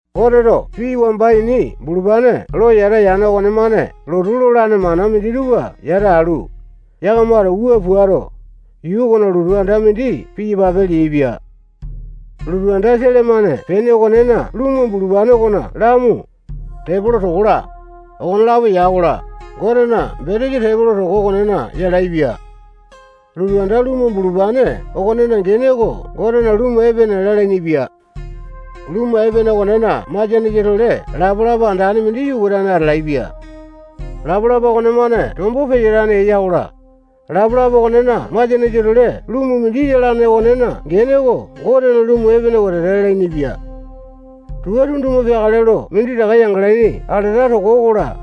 Goteto pii wamba ini bulupane lo yata yane okonemane lotu lolane mana minditupa yata alu, yakamato wua puato, yuu okona lotu anda mindi piyapape leaipia. Lotu anda sele-mane pene okonena lumu bulupane okona lamu, tepolo toko-la, okonelapo ya-kola, Gotena betesa tepolo toko okonena yalaepia. Lotu anda lumu bulupane okonena gene oko Gotena lumu epene lalainipia. Lumu epene okonena masianesa tole lapalapa andane mindi yukatane atalaepia. Lapalapa okonemane tombo peyatane eya-kola, lapalapa okonena masianesa tole lumu mindi yalane okonena gene oko Gotena lumu epene wetete lalainipia. Tua tunduma peakale lo minditaka yangalaini alata toko okola,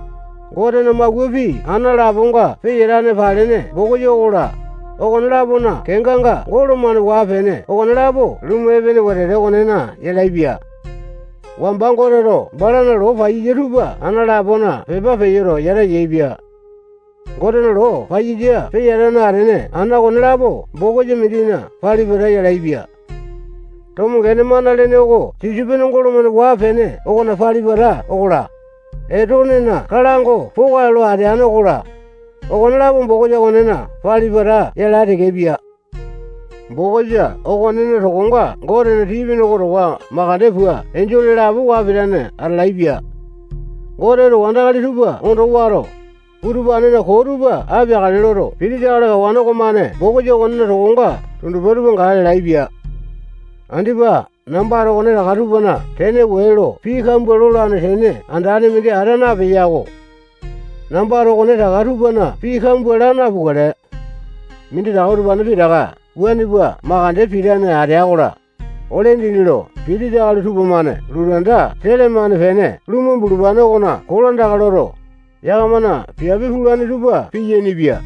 Gotena mawua pii ana laponga peyatane palene bokisa okola, okone-lapona kenganga golo-mane waa-pene okonelapo lumu epene wetete okonena yalaepia. Wamba Goteto balana loo paiyasa tupa ana lapona pepa peyoto, yata yaepia. Gotena loo paiyasa peyatane atene ana okonelapo bokisa mindina pali-pata yalaepia. Tomo gene mana lene oko sisopene golo-mane waa-pene okona pali-pata okola, Etonena kalango poka lo ateane okola, okonelapo bokisa okonena pali-pata yalae tekepia. Bokisa okonena tokonga Gotena tii-pene oko towa makande pua enjole lapo waa pitane atalaepia. Goteto wandakali tupa ondo wato, utupanena koo tupa apeakale loto, pitisa akali kawane okomane bokisa okonena tokonga tundupa tupa gae lalaepia. Andipa nambato okonetaka tupana tene wee lo pii kambua lolane tene andane mindi ata napeya-ko. Nambato okonetaka tupana pii kambua laa napukale. Minditaka utupane pitaka wuane pua mandeke pitane atea-kola, ole dindi lo pitisa akali tupamane lotu anda sele-mane pene lumu bulupane okona kolandaka loto, yakamana piape pulane tupa piyainipia.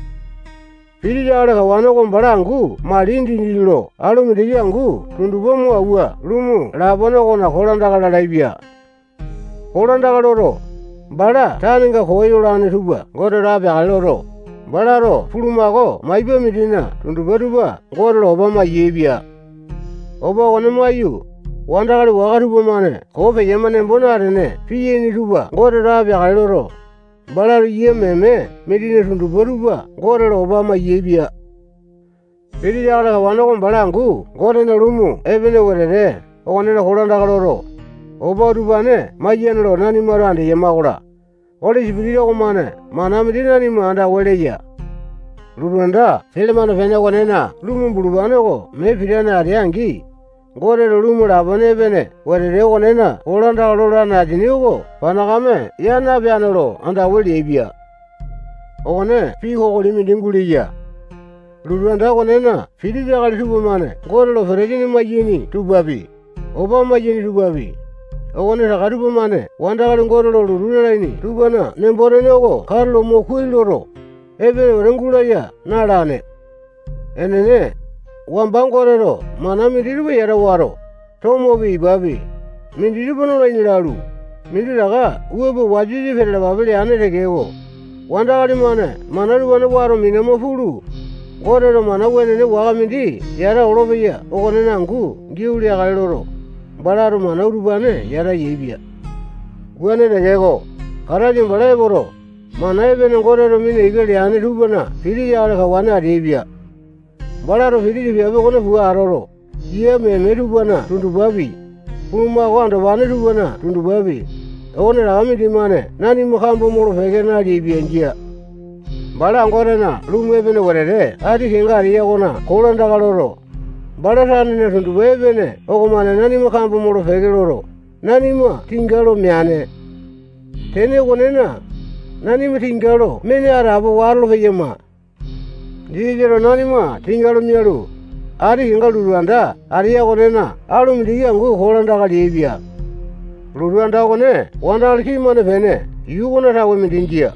Pitisa akali kawane oko bala angu mali dindi lo alu mindiki angu tundupa mo awua lumu lapone okona kolandaka lalaepia. Kolandaka loto, bala tanenga koo yolane tupa Goteto apeakale loto, balato bulumako maipa mindina tundupa tupa Gote lo opa mayaepia. Opa okone maiyu, wandakali waka tupamane koo peyama nembo natene piyaini tupa Goteto apeakale loto, balato yia meme mindina tundupa tupa Gote lo opa mayaepia. Pitisa akali kawane oko bala angu Gotena lumu epene wetete okone kolandaka loto, opa utupane maiyane lo nanimato andeyama-kola, Oli Sipitisa okomane mana mindi nanima andawa leya. Lotu anda sele-mane pene okonena lumu bulupane oko mee pitane atea-angi, Gotena lumu lapone epene wetete okonena kolandaka lolane asini oko panakame ya napeane lo andawa leaipia. Okone pii kokoli mindi guleya. Lotu anda okonena pitisa akali tupamane Gote lo petesini maiyaini tupapi, opa maiyaini tupapi, okonetaka tupamane wandakali Gote lo lotu lalaini tupana nembo-tene oko katulo mo kuai loto, epene wete gulaya na-alane. Enene, wamba Goteto mana minditupa yata wato, tomopi, ipapi, minditupa nolaini lalu, minditaka wua pua wasa-wasa peyalapape leane tekeko, wandakali-mane mana utupane wato minama pulu, Goteto mana wenene waka mindi yata olopeya okonena angu giau leakale loto, balato mana utupane yata yaepia. Wuane tekeko, Kataisa bala epoto, mana epene Goteto mina ika leane tupana pitisa akali kawane ateaipia. Balato pitisa piape okone pua atoto, yia meme tupana tundupapi, bulumako andopane tupana tundupapi, okonetaka mindimane nanima kambo molo-peke naleaipia. Jia. Bala Gotena lumu epene wetete ati kenga ateya okona kolandaka loto, bala tanena tundupa epene okomane nanima kambo molo-peke loto, nanima tinga lo meane. Tene okonena, nanima tinga lo mene atapowa atolo-peyama. Jisasato nanima tinga lo mialu, ati kenga lotu anda ateya okonena alu mindiki angu kolandaka leaipia. Lotu anda okone wandakali kii-mane pene yuu okona tawe mindi jia.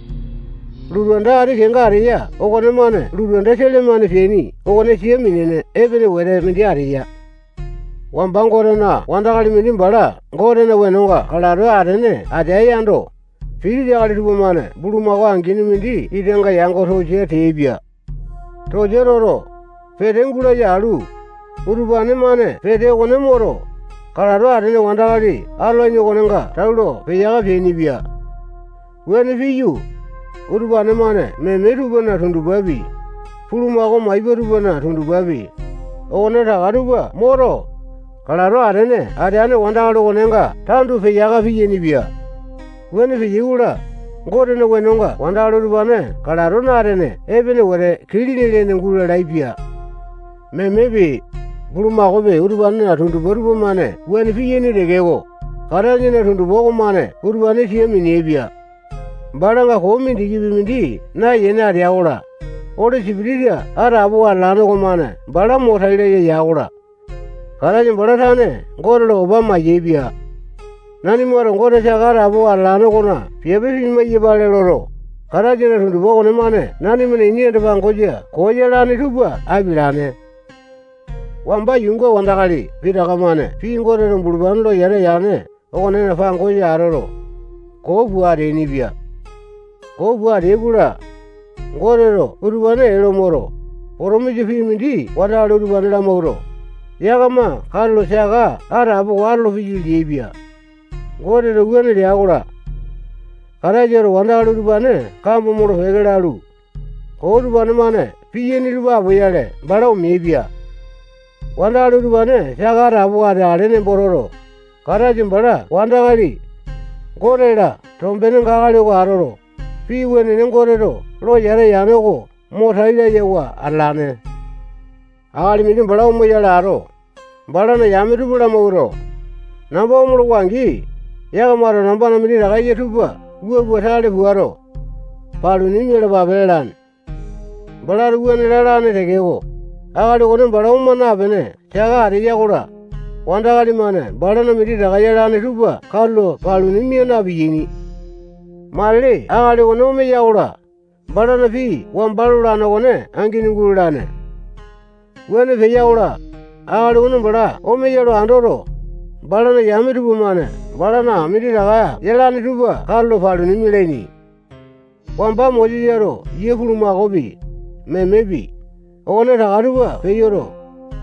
Lotu anda ati kenga ateya okonemane lotu anda sele-mane peaini okone sia minene epene wete mindi ateya. Wamba Gotena wandakali mindi bala Gotena wenonga kalato atene atea yando, pitisa akali tupamane bulumako angini mindi itanga yango tosia teaipia. Tosia toto, pete gulaya alu, utupane-mane pete okone moto, kalato atene wandakali atolane okonenga tau lo peyaka peainipia. Wuane piyu, utupane-mane meme tupana tundupapi, bulumako maipa tupana tundupapi, okonetaka tupa moto, kalato atene ateane wandakali okonenga tandu peyaka peainipia. Wuane peyai-kola, Gotena wenonga wandakali utupane kalato na-atene epene wete kilini lene gulalaepia. Memepi, bulumakaopi, utupanena tundupa tupamane wuane piyaini tekeko, Kataisana tundupa okomane utupane sia mineaipia. Balanga koo mindikipi mindi nayene atea-kola, Oli Sipitisa atapowa atalane okomane bala mo tai laya ya-kola, Kataisa bala tane Gote lo opa mayaepia. Nanimato Gote saka atapowa atalane okona piape pimai-yapale loto, Kataisana tundupa okonemane nanimana ini anda-pangosa koo yalane tupa apialane. Wamba yuunga wandakali pitaka-mane pii Goteto bulupane lo yata yane okonena pangosa atoto, koo pua ateainipia. Koo pua ateai-kola, Goteto utupane ee lo moto, potomisa pii mindi wandakali utupane lamawuato, yakama katulo saka atapowa atolopeyai leaipia. Goteto wuane lea-kola, Kataisato wandakali utupane kambo molo-peke lalu, koo utupane-mane piyaini tupa apoyale bala omeaipia. Wandakali utupane saka atapowa ateakale nembo toto, Kataisa bala wandakali, Gote-la tombenga akali oko atoto, pii wenene Goteto lo yata yane oko mo tai layawa atalane. Akali mindi bala omoyale ato, balana yame tupa lamawuato, namba omolowa-angi, yakamato nambana minditaka eya tupa wua pua tale puato, paluni mialapape lalane. Balato wuane lalane tekeko, akali okone bala oma napene saka ateya-kola, wandakali-mane balana minditaka yalane tupa katulo paluni mia na-piyaini. Matili akali okone omeya-kola, balana pii wamba lolane okone angini gulalane. Wuane peya-kola, akali okone bala omeya lo andoto, balana yame tupamane balana minditaka yalane tupa katulo paluni mialaini. Wamba Mosesato yia bulumakaopi, memepi, okonetaka tupa peyoto,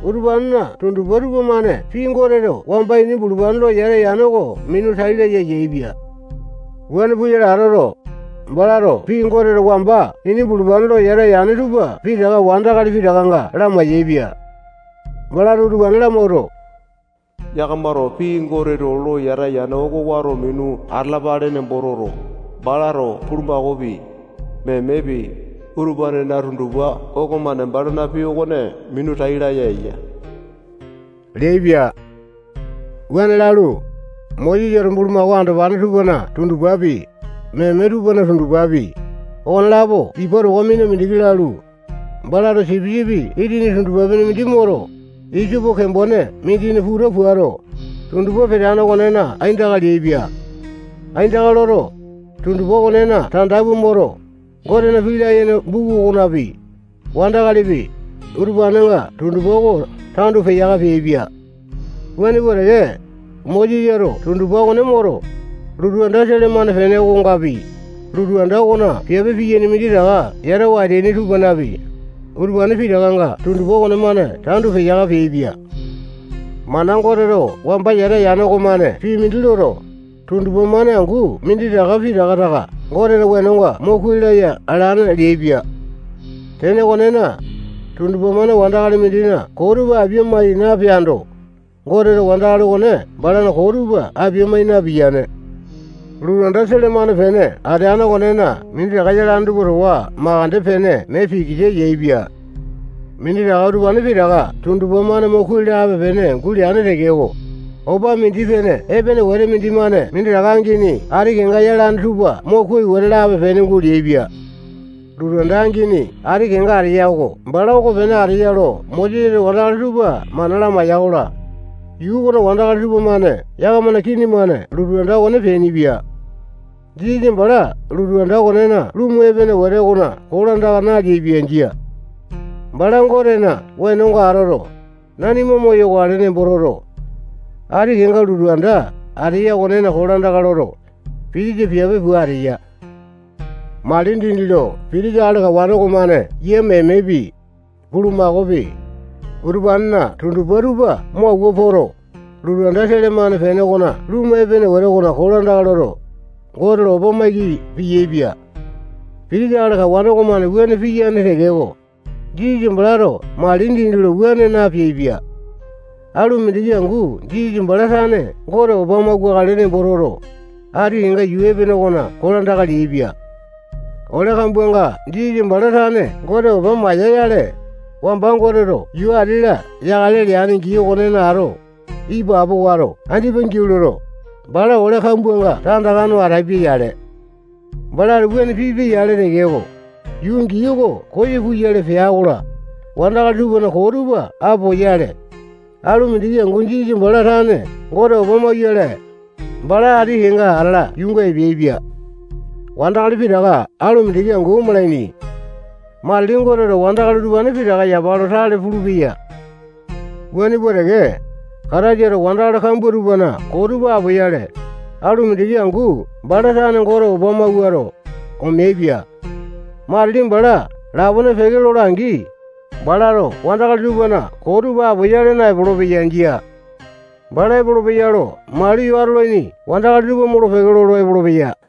utupanena tundupa tupamane pii Goteto wamba ini bulupane lo yata yane oko minu tai laya yaepia. Wuane puyale atoto, balato pii Goteto wamba ini bulupane lo yata yane tupa pitaka wandakali pitakanga lamai-yaepia. Balato utupane lamawuato, yakamato pii Goteto lo yata yane oko wato minu atalapale nembo toto, balato bulumakaopi, memepi, utupanena tundupa okomane balana pii okone minu tai laya eya leaipia. Wuane lalu, Mosesato bulumako andopane tupana tundupapi, meme tupana tundupapi, okonelapo ipa towa mina mindiki lalu, balato sipisipi itini tundupa-pene mindi moto, isopo kembone mindina puta puato, tundupa peteane okonena aindaka leaipia. Aindaka loto, tundupa okonena tanda pua moto, Gotena pii layene buku okonapi, wandakalipi, utupanenga tundupa oko tandu peyaka peaipia. Wuane pua teke, Mosesato tundupa okone moto, lotu anda sele-mane pene okongapi, lotu anda okona piape piyaini minditaka yatawa ateaini tupanapi, utupane pitakanga tundupa okonemane tandu peyaka peaipia. Mana Goteto wamba yata yane okomane pii mindi loto, tundupa-mane angu minditaka pitaka taka Gotena wenonga mo kuai laya alane leaipia. Tene okonena, tundupa-mane wandakali mindina koo tupa apia-mai napeaindo, Goteto wandakali okone balana koo tupa apia-mai napiyane. Lotu anda sele-mane pene ateane okonena minditaka yane tupa ati kenga minditaka yalane tupa towa makande pene mee pikisa yaepia. Minditaka utupane pitaka tundupa-mane mo kuai lape-pene guleane tekeko, opa mindi-pene epene wete mindimane minditaka angini ati kenga yalane tupa mo kuai wete lape-pene guleaipia. Lotu anda angini ati kenga ateya oko bala okonepene ateya lo Mosesato wandakali tupa mana lamaiya-kola, yuu okona wandakali tupamane yakamana kini-mane lotu anda okone peainipia. Jisasa bala lotu anda okonena lumu epene wete okona kolandaka naleaipia. Jia. Bala Gotena wenonga atoto, nanima moyokale nembo toto, ati kenga lotu anda ateya okonena kolandaka loto, pitisa piape pua ateya. Mali dindi lo pitisa akali kawane okomane yia memepi, bulumakaopi, utupanena tundupa tupa mo awua poto, lotu anda sele-mane pene okona lumu epene wete okona kolandaka loto, Gote lo opa maiki piyaepia. Pitisa akali kawane okomane wuane piyane tekeko, Jisasa balato mali dindi lo wuane napeaipia. Alu mindiki angu Jisasa bala tane Gote opa mauwakale nembo toto, ati kenga yuu epene okona kolandaka leaipia. Ole kambuanga Jisasa bala tane Gote opa maiya-yale, wamba Goteto yuu ati-la yakale leane gii okonena ato, ipapo wato andipa giau loto, bala ole kambuanga tandaka no atapia-yale. Balato wuane pipia-yale tekeko, yuu gii oko koyo puyale pea-kola, wandakali tupana koo tupa apoyale, alu mindiki angu Jisasa bala tane Gote opa mauyale, bala ati kenga atala yuunga epeaipia. Wandakali pitaka alu mindiki angu omalaini. Matili Goteto wandakali utupane pitaka yapa lo tale pulupeya. Wuane pua teke, Kataisato wandakali kambua tupana koo tupa apoyale, alu mindiki angu bala tane Gote opa mawuato, omeaipia. Matili bala lapone peke lola-angi, balato wandakali tupana koo tupa apoyale naepolo-peya. Jia. Bala epolopeya lo maliyo atolaini wandakali tupa molo-peke lolo epolopeya.